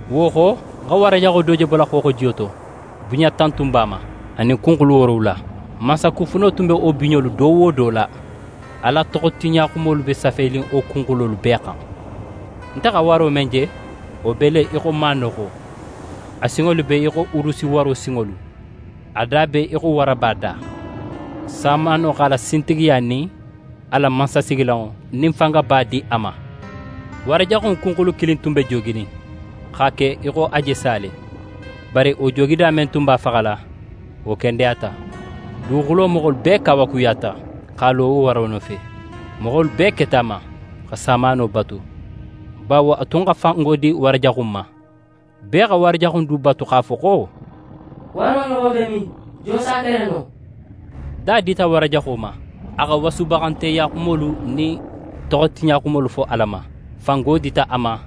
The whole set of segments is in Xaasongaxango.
Wo xo, ń xa wara jaxo do je bola xooxojiyo to. Biɲa tan tun b'a ma, anin kunxulu woorowula. Mansakufuno tun be wo biɲolu do wo do la, Ala toxotiɲatoxolu be safenin wo kunxulolu bee xan. Nte xa waro men je, wo be le í xo maanoxo, a sinŋolu be í xo urusi waro sinŋolu, a da be í xo waraba da. Samaano x'a la sintigiya nin a la mansasigilanŋo nin fangaba di a ma. Wara jaxu in kunxulu kilin tun be jooginin x'a ke í xo a je sa le. Bari wo joogida men tun be a faxala, wo kendeyata. Duguxulo moxolu bee kawakuyata x'a lo wo waro nofe. Moxolu bee keta a ma xa samaano batu, bawo a tun xa fango di wara jaxu in ma. Bee xa wara jaxu in du batu x'a fo xo: «Waro ɲoxon be min? Jon s'a kele no?» Da dita wara jaxo ma a xa wasubaxanteya xumolu nin toxotiɲaxumolu fo Ala ma. Fango dita a ma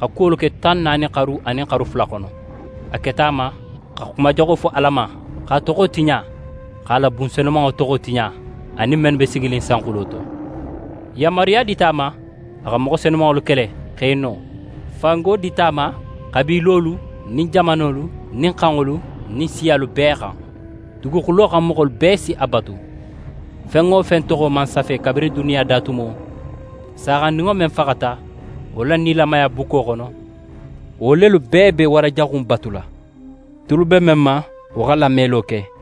xa kuwolu ke tan naani xaru anin xaru fula xono. A keta a ma xa xuma jaxo fo Ala ma, x'a toxo tiɲa, x'a la bun senumanŋo toxo tiɲa, anin mennu be siginin sanxulo to. Yanmaruya dita a ma a xa moxo senumanŋolu kele, x'e no. Fango dita a ma xabiilolu nin jamanolu nin xanŋolu nin siyalu bee xan. Duguxulo xan moxolu bee si a batu. Fen wo fen toxo man safe kabirin duniya da tumo, Saaxandinŋo men faxata wo la nilamaya bukko xono, wo lelu bee be wara jaxu in batula. «Tulu be men ma, wo xa lamelo ke!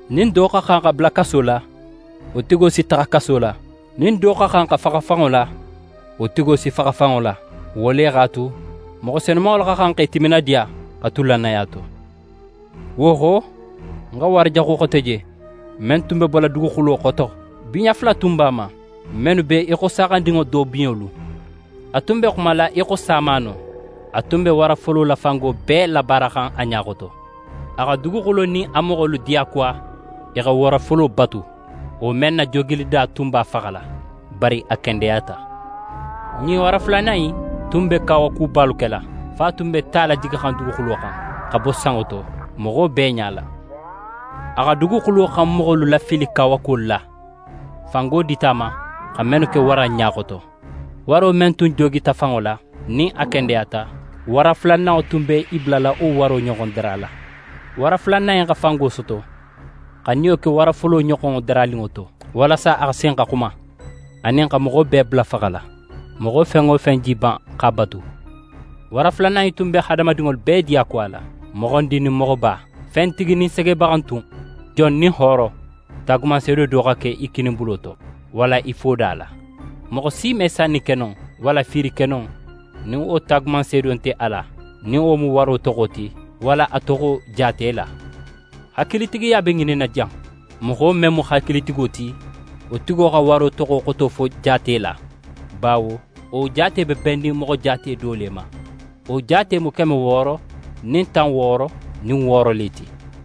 Nin do xa xan xa bula kaso la, wo tigo si taxa kaso la, nin do xa xan xa faxa fanŋo la, wo tigo si faxa fanŋo la. Wo le x'a tu, moxo senumanŋolu xa xan x'e timinadiya xa tu lannaya to.» Wo xo, ń xa wara jaxu xote je, men tun be bola duguxulo xoto. Biɲa fula tun b'a ma, mennu be í xo saaxandinŋo do biɲolu. A tun be xumala í xo samaano. A tun be wara folo la fango bee labaaraxan a ɲa xoto. A xa duguxulo nin a moxolu diyakuwa i xa wara folo batu, wo men na joogilida tun b'a faxala, bari a kendeyata. Ɲin wara fulanan in tun be kawakubalu kela, fo a tun be ta lajigixan duguxulo xan xa bo sanŋo to moxo bee ɲala. A xa duguxulo xan moxolu lafili kawakuwolu la, fango dita a ma xa mennu ke wara in ɲa xoto. Waro men tun joogita fanŋo la, nin a kendeyata, wara fulananŋo tun be i bulala wo waro ɲoxonŋo darala. Wara fulanan in xa fango soto xa niyo ke wara folo ɲoxonŋo daraninŋo to, walasa a xa sin xa xuma, anin xa moxo bee bula faxala, moxo fen wo fen je í ban x'a batu. Wara fulanan in tun be hadamadinŋolu bee diyakuwala, moxondin nin moxoba, fentigi nin segebaxantun, jon nin hooro, taagumanseedo do xa ke i kininbulo to, walla i foda la. Moxo si me sanni ke no, walla fiiri ke no nin wo taagumanseedo nte a la, nin wo mu waro toxo ti, walla a toxo jaate la. Hakilitigiya be ŋininna jan. Moxo men mu hakilitigo ti, wo tigo xa waro toxo xoto fo jaate la, bawo wo jaate be bennin moxo jaate do le ma. Wo jaate mu keme wooro nin tan wooro nin wooro le ti.